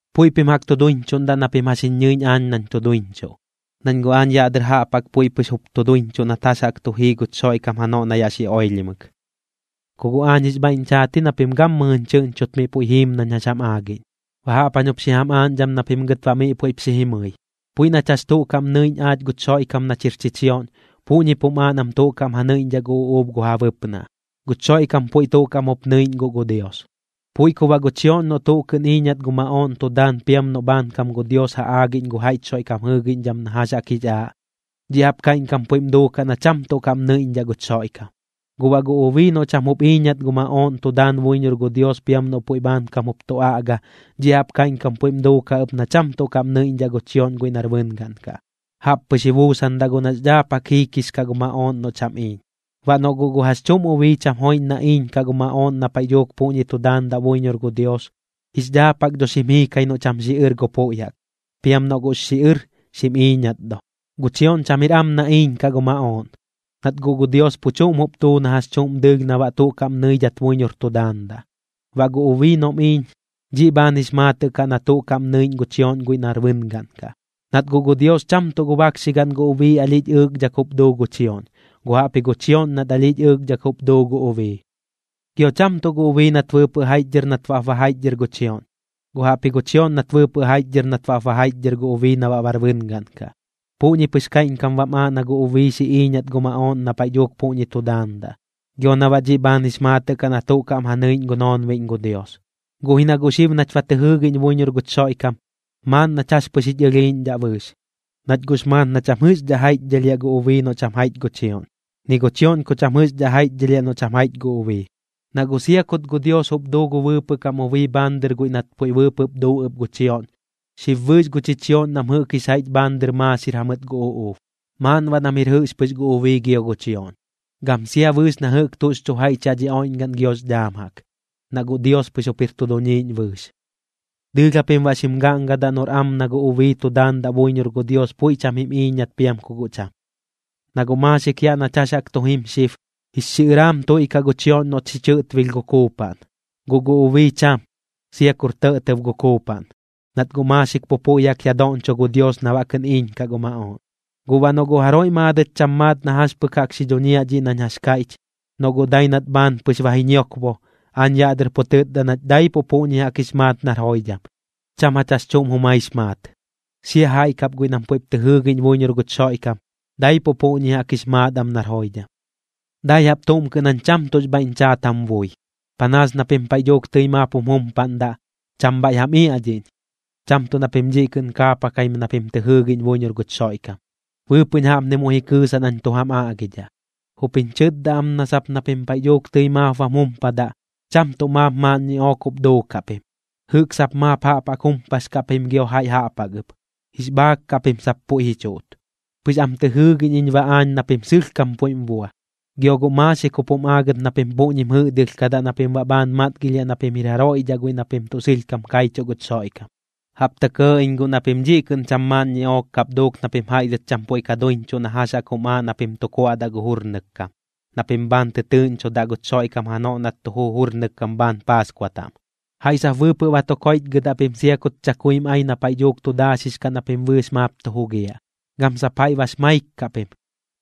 Puiꞌ pim jaꞌk tu duiñchuꞌndaꞌ na pim jax jiñ ñɨiꞌñ aañ nañ tu duiñchuꞌ, nañ guꞌ aañ yaꞌ dɨr jaꞌp jaꞌk puiꞌ pɨx jup tu duiñchuꞌ nat jax jaꞌk tu jii guch Xoiꞌkam janoꞌ na yaꞌ xi oilhimɨk. Ku guꞌ aañ jix bhaiꞌñ chaat ji na pim gammɨjɨñ chɨꞌñchot miꞌ puiꞌ jiim nañ jax jam aagiꞌñ. Baꞌ jaꞌp jañ jup xi jam aaꞌñdham na pim gɨt baꞌ miꞌ puiꞌp xi jimɨi: Puiꞌ nach jax tuꞌ kaꞌm nɨiꞌñ aach guch Xoiꞌkam nach jir chichioꞌñ, puꞌñip jum aaꞌ nam tuꞌ kaꞌm ja nɨiꞌñdhaꞌ gu uꞌuub gu ja bɨpnaꞌ. Guch Xoiꞌkam puiꞌ tuꞌ kaꞌm jup nɨiꞌñ guꞌ gu Dios. Puiꞌ ku baꞌ gu chioꞌñ noꞌ tuꞌ kɨꞌn iiñat gu maꞌooꞌn tu daan piam noꞌ bhaankam gu Dios ja aagiꞌñ gu jaiꞌch Xoiꞌkam jɨɨgiꞌñdham na jax jaꞌk jix aaꞌ, dhiꞌ jaꞌp kaiꞌñkam puiꞌm duukaꞌ na cham tuꞌ kaꞌm nɨiꞌñdhaꞌ guch Xoiꞌkam. Guꞌ baꞌ gu ubii noꞌ cham jup iiñat gu maꞌooꞌn tu daan buiñor gu Dios piam noꞌ puiꞌ bhaankam jup tu aꞌga, dhiꞌ jaꞌp kaiꞌñkam puiꞌm duukaꞌ ɨp na cham tuꞌ kaꞌm nɨiꞌñdhaꞌ gu chioꞌñ guiꞌ nar bɨngaꞌn kaꞌ. Jaꞌp pɨx ji buusandaꞌ guꞌ nax dhaapkam jiikix kaꞌ gu maꞌooꞌn noꞌ cham iiñ. Baꞌ noꞌ guꞌ gu jax chuꞌm ubii cham joiꞌñ na iiñkaꞌ gu maꞌooꞌn na paiꞌ dhuuk puꞌñi tu daandaꞌ buiñor gu Dios, jix dhaapkam dho xim jiikai noꞌ cham xiꞌɨr gu puiꞌ jaꞌk. Piam noꞌ guꞌx xiꞌɨr, xim iiñat do. Gu chioꞌñ cham jir am na iiñkaꞌ gu maꞌooꞌn, nat guꞌ gu Dios pu chuꞌm jup duu na jax chuꞌm dɨɨlh na baꞌ tuꞌ kaꞌm nɨidhat buiñor tu daandaꞌ. Baꞌ gu ubii noꞌm iiñ, dhiꞌ bhaan jup jix maatɨꞌ kaꞌ na tuꞌ kaꞌm nɨiꞌñ gu chioꞌñ guiꞌ nar bɨngaꞌn kaꞌ. Nat guꞌ gu Dios cham tuꞌ gu bakxigaꞌn gu ubii alhiꞌch ɨɨkdhak jup duu gu chioꞌñ, guꞌ jaꞌpji gu chioꞌñ nat alhiꞌch ɨɨkdhak jup duu gu ubii. Gio cham tuꞌ gu ubii nat bɨɨpɨꞌ jaiꞌchdhɨr nat baꞌp ba jaiꞌchdhɨr gu chioꞌñ, guꞌ jaꞌpji gu chioꞌñ nat bɨɨpɨꞌ jaiꞌchdhɨr nat baꞌp ba jaiꞌchdhɨr gu ubii na baꞌ bar bɨngaꞌn kaꞌ. Puꞌñi pɨx kaiꞌñkam baꞌm aaꞌ na gu ubii xi iiñat gu maꞌooꞌn na paiꞌ dhuuk puꞌñi tu daandaꞌ, gio na baꞌ dhiꞌ bhaan jix maatɨꞌ kaꞌ na tuꞌ kaꞌm ja nɨiꞌñ gu noonbiꞌñ gu Dios. Guꞌ ji na guꞌ xib nach ba tɨ jɨɨgiꞌñ buiñor guch Xoiꞌkam, maaꞌn nach jax pɨx jich ɨlhiiꞌñdhaꞌ bɨɨx. Nach guꞌx maat na cham jɨꞌxdhat jaiꞌchdhɨlhiaꞌ gu ubii noꞌ cham jaiꞌch gu chioꞌñ, ni gu chioꞌñ ku cham jɨꞌxdhaꞌ jaiꞌchdhɨlhiaꞌ noꞌ cham jaiꞌch gu ubii. Na guꞌ sia kut gu Dios jup duu gu bɨɨpɨꞌ kam ubii bhaan dɨr guiꞌ nat puiꞌ bɨɨpɨꞌp duu ɨp gu chioꞌñ, xib bɨɨx gu chichioꞌñ nam jɨꞌk jix jaiꞌch bhaan dɨr maaxir jamɨt gu uꞌuub. Maaꞌn baꞌ nam jir jɨꞌx pɨx gu ubii gio gu chioꞌñ, gam sia bɨɨx na jɨꞌk tuꞌx chu jaiꞌch yaꞌ dhi oiꞌñgaꞌn giox dhaam jaꞌk, na guꞌ Dios pɨx jup jir tu duñiiꞌñ bɨɨx. Dɨɨlh japim baꞌ xim gaꞌngadaꞌ noꞌr am na gu ubii tu daandaꞌ buiñor gu Dios puiꞌ cham jim iiñat piam ku guꞌ cham. Na guꞌ maaxik yaꞌ nach jax jaꞌk tu jim xib, jix xiꞌɨraam tuiꞌkaꞌ gu chioꞌñ noꞌt xi chɨꞌtbilh gu kuupaꞌn, guꞌ gu ubii cham, sia kur tɇꞌtɇb gu kuupaꞌn, nat guꞌ maaxik pu puiꞌ jaꞌk ya doꞌñcho gu Dios na baꞌ kɨꞌn iiñkaꞌ gu maꞌooꞌn. Guꞌ baꞌ noꞌ guꞌ jaroiꞌ maadɨt cham maat na jax pɨk jaꞌk xi dhuñiaꞌ dhiꞌ nañ jax kaiꞌch, noꞌ guꞌ dai nat bhaan pɨx ba ji ñiokbo, aañ yaꞌ dɨr pu tɨtda nach daipuꞌ puꞌñi jaꞌk jix maat nar joidham, cham jach jax chuꞌm jumaix maat. Sia jaiꞌ kap guiꞌ nam puiꞌp tɨ jɨɨgiꞌñ buiñor guch Xoiꞌkam, daipuꞌ puꞌñi jaꞌk jix maat am nar joidham. Dai jaꞌp tuꞌm kɨꞌn jañ cham tuꞌx bhaiꞌñ chaat jam bui, panaas na pim paiꞌ dhuuk tɨi maap jum jumpaꞌndaꞌ, cham bhaiꞌ jam iaꞌdhiꞌñ, cham tuꞌ na pim dhiꞌ kɨꞌn kaapakaim na pim tɨ jɨɨgiꞌñ buiñor guch Xoiꞌkam. Bɨɨpɨꞌñ jaꞌpni muiꞌ ji kɨɨsaꞌ nañ tu jam aꞌgidhaꞌ: Jup jiñ chɨtda am na sap na pim paiꞌ dhuuk tɨi maap bam jumpadaꞌ, cham tuꞌ maap maaꞌn ñiꞌook jup duukaꞌ pim, jɨꞌk sap maap jaꞌp jaꞌk jumpax kaꞌ pim gio jaiꞌ jaꞌp jaꞌk ɨp, jix bhaak kaꞌ pim sap puiꞌ ji chuꞌt. Pɨx am tɨ jɨɨgiꞌñ iñ baꞌ aañ na pim sɨlhkam puiꞌm bua. Gio guꞌ maaxik jup jum aagɨt na pim puꞌñim jɨꞌdɨlhkadaꞌ na pim baꞌ bhaan matgilhiaꞌ na pim jir jaroiꞌ dhaꞌ guiꞌ na pim tuꞌ sɨlhkam kaichuꞌ guch Xoiꞌkam. Jaꞌp tɇ kɇɇ iñ guꞌ na pim dhiꞌ kɨꞌn cham maaꞌn ñiꞌook kap duuk na pim jaiꞌ dhɨt cham puiꞌ ka duiñchuꞌ na jax jaꞌk jum aaꞌ na pim tu kuaꞌdaꞌ gu jurnɨk kam, na pim bhaan tɨtɨɨꞌñchodaꞌ guch Xoiꞌkam janoꞌ nat tu juu jurnɨk kam bhaan Paaskua taꞌm. Jaiꞌ sap bɨɨpɨꞌ ba tu koiꞌchgɨdaꞌ pim sia kut chakuim ai na paiꞌ dhuuk tu daaxix kaꞌ na pim bɨɨx maap tu jugiaꞌ, gam sap jaiꞌ bax maik kaꞌ pim.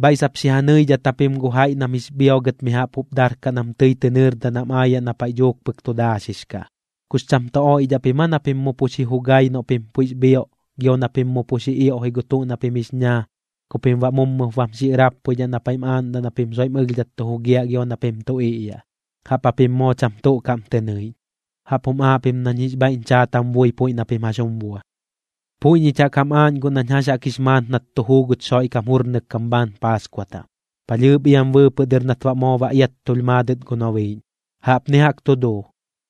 Bhaiꞌ sap xi ja nɨidhat japim gu jaiꞌ nam jix bhiogɨt mi jaꞌp jup darkaꞌ nam tɨi tɨ nɨɨrdaꞌ nam aayaꞌ na paiꞌ dhuuk pɨk tu daaxix kaꞌ. ¿Kux cham tu oiꞌdhaꞌ pim aa na pim mu pu xi chu jugai noꞌ pim puiꞌx bhioꞌ gio na pim mu pu xi ioꞌji gu tuꞌ na pim jix ñaa ku pim baꞌ mummɨp bam xiꞌɨrappuidhaꞌ na paiꞌm aaꞌndaꞌ na pim soiꞌm ɨlhdhat tu jugiaꞌ gio na pim tu iꞌyaꞌ? Jaꞌp japim moo cham tuꞌ kaꞌm tɨ nɨiꞌñ. Jaꞌp jum aaꞌ pim nañ jix bhaiꞌñ chaat jam bui puiꞌ na pim jax jum bua. Puiꞌ ñich jaꞌk jam aaꞌñ guꞌ nañ jax jaꞌk jix maat nat tu juu guch Xoiꞌkam jurnɨk kam bhaan Paaskua taꞌm, palhɨɨp iam bɨɨpɨꞌ dɨr nat baꞌ moo ba iattulh maadɨt gu nobiiꞌñ. Jaꞌpni jaꞌk tu duu: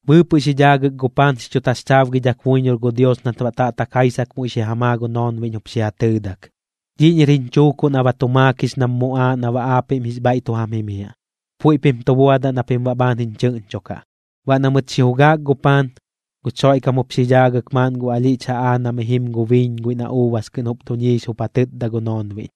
Bɨɨpɨꞌ xi dhaagɨk gu paan xi chu taxchaabgidhak buiñor gu Dios nat baꞌ taꞌtak jaisak muiꞌ xi ja maa gu noonbiꞌñ jup xi ja tɨɨdak: “Dhiꞌñir jiñ chuukuꞌ na ba tu maakix nam muꞌaaꞌ na baꞌ aapiꞌm jix bhaiꞌ tu jam jimiaꞌ. Puiꞌ pim tu buadaꞌ na pim baꞌ bhaan jiñ chɨꞌñchokaꞌ.” Baꞌ na mɨt xi jugaak gu paan, guch Xoiꞌkam jup xi dhaagɨk maaꞌn gu alhiꞌch jaꞌaa na mi jim gu biiñ guiꞌ na uubas kɨꞌn jup duñiix jup ja tɨtda gu noonbiꞌñ: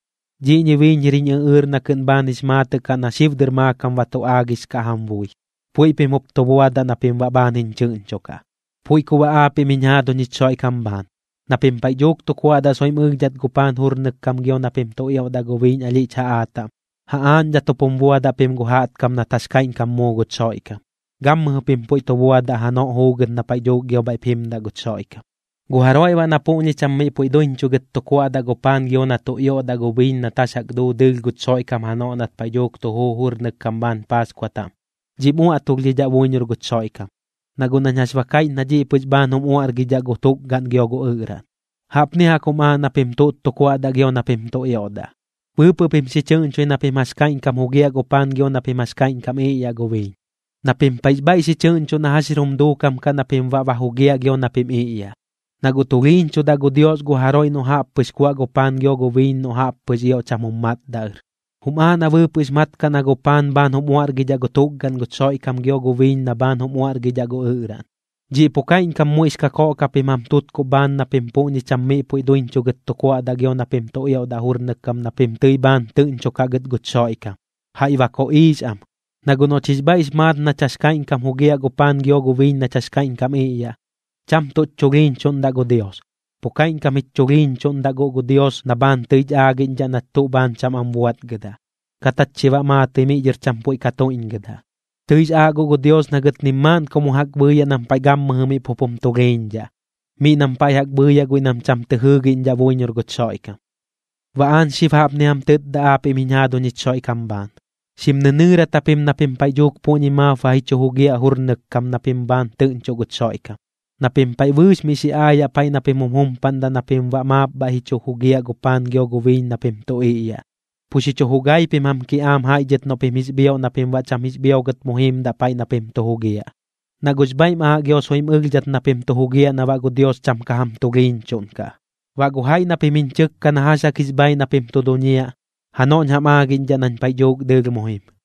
“Dhiꞌñi biiñ jir jiñ ɨꞌɨɨr na kɨꞌn bhaan jix maatɨꞌ kaꞌ na xib dɨr maakam ba tu aagix kaꞌ jam bui. Puiꞌ pim jup tu buadaꞌ na pim baꞌ bhaan jiñ chɨꞌñchokaꞌ.” Puiꞌ ku baꞌ aapiꞌm jiñ jaaduñ jich Xoiꞌkam bhaan, na pim paiꞌ dhuuk tu kuaꞌdaꞌ soiꞌm ɨlhdhat gu paan jurnɨk kam gio na pim tu ioꞌdaꞌ gu biiñ alhiꞌch jaꞌaa taꞌm, ja aaꞌñdhat jup jum buadaꞌ pim gu jaꞌtkam nat jax kaiꞌñkam muu guch Xoiꞌkam. Gammɨjɨ pim puiꞌ pu tu buadaꞌ janoꞌ juugɨt na paiꞌ dhuuk gio bhaiꞌp jimdaꞌ guch Xoiꞌkam. Gu jaroiꞌ baꞌ na puꞌñi cham miꞌ puiꞌ duiñchugɨt tu kuaꞌdaꞌ gu paan gio na tu ioꞌdaꞌ gu biiñ nat jax jaꞌk duu dɨɨlh guch Xoiꞌkam janoꞌ nat paiꞌ dhuuk tu juu jurnɨk kam bhaan Paaskua taꞌm, dhiꞌm uaꞌtulhdhidhaꞌ buiñor guch Xoiꞌkam, na guꞌ nañ jax ba kaiꞌch na dhiꞌ pɨx bhaan jum uaꞌrgiꞌñdhaꞌ gu tukgaꞌn gio gu ɨꞌraꞌn. Jaꞌpni jaꞌk jum aaꞌ na pim tuꞌt tu kuaꞌdaꞌ gio na pim tu ioꞌdaꞌ: Bɨɨpɨꞌ pim xi chɨꞌñchoi na pim jax kaiꞌñkam jugiaꞌ gu paan gio na pim jax kaiꞌñkam iꞌyaꞌ gu biiñ, na pim paiꞌx bhaiꞌ xi chɨꞌñchoꞌ na jax jir jum duukam kaꞌ na pim baꞌ ba jugiaꞌ gio na pim iꞌyaꞌ. Na guꞌ tulhiiñchudaꞌ gu Dios gu jaroiꞌ noꞌ jaꞌp pɨx kuaꞌ gu paan gio gu biiñ noꞌ jaꞌp pɨx ioꞌ cham jum matdaꞌ ɨr. Jum aaꞌ na bɨɨpɨꞌx mat kaꞌ na gu paan bhaan jum uaꞌrgidhaꞌ gu tukgaꞌn guch Xoiꞌkam gio gu biiñ na bhaan jup jum uaꞌrgidhaꞌ gu ɨꞌraꞌn. Dhiꞌ pu kaiꞌñkam muiꞌx kakoꞌk japim jam tutkuꞌ bhaan na pim puꞌñi cham miꞌ puiꞌ duiñchugɨt tu kuaꞌdaꞌ gio na pim tu ioꞌdaꞌ jurnɨk kam na pim tɨi bhaan tɨꞌñchokaꞌ gɨt guch Xoiꞌkam, jaiꞌ ba koꞌiix am. Na guꞌ noꞌch jix bhaiꞌx maat nach jax kaiꞌñkam jugiaꞌ gu paan gio gu biiñ nach kaiꞌñkam iꞌyaꞌ, cham tuꞌch chulhiiñchuꞌndaꞌ gu Dios. Pu kaiꞌñkam jich chulhiiñchuꞌndaꞌ guꞌ gu Dios na bhaan tɨich aagiꞌñdhaꞌ nach tuꞌ bhaan cham am buaꞌtgɨdaꞌ, kat jach chi baꞌ maatɨi miꞌ dhɨr cham puiꞌ ka tuiꞌñgɨdaꞌ. Tɨix aaꞌ guꞌ gu Dios na gɨt nim maaꞌn ku mu jaꞌk bhɨɨyaꞌ nam paiꞌ gammɨjɨ miꞌ pup jim tulhiiñdhaꞌ, miꞌ nam paiꞌ jaꞌk bhɨɨyaꞌ guiꞌ nam cham tɨ jɨɨꞌñdhaꞌ buiñor guch Xoiꞌkam. Baꞌ aañ xib jaꞌpni jam tɨtda aapiꞌm jiñ jaaduñ jich Xoiꞌkam bhaan: Xim nɨnɨɨrat japim na pim paiꞌ dhuuk puꞌñi maap ba ji chu jugiaꞌ jurnɨk kam na pim bhaan tɨꞌñchoꞌ guch Xoiꞌkam, na pim paiꞌ bɨɨx miꞌ xi aayaꞌ paiꞌ na pim jum jumpadaꞌ na pim baꞌ maap bhaiꞌ ji chu jugiaꞌ gu paan gio gu biiñ na pim tu iꞌyaꞌ. Pu xi chu jugai pim jam kiꞌaam jaiꞌ dhɨt noꞌ pim jix bhioꞌ na pim baꞌ cham jix bhiogɨt mu jiimdaꞌ paiꞌ na pim tu jugiaꞌ, na guꞌx bhaiꞌm aaꞌ gio soiꞌm ɨlhdhat na pim tu jugiaꞌ na baꞌ gu Dios cham ka jam tulhiiñchuꞌnkaꞌ. Baꞌ gu jaiꞌ na pim jiñ chɨkka na jax jaꞌk jix bhaiꞌ na pim tu duñiaꞌ, janoꞌñ jam aagiꞌñdhaꞌ nañ paiꞌ dhuuk dɨɨlh mu jim.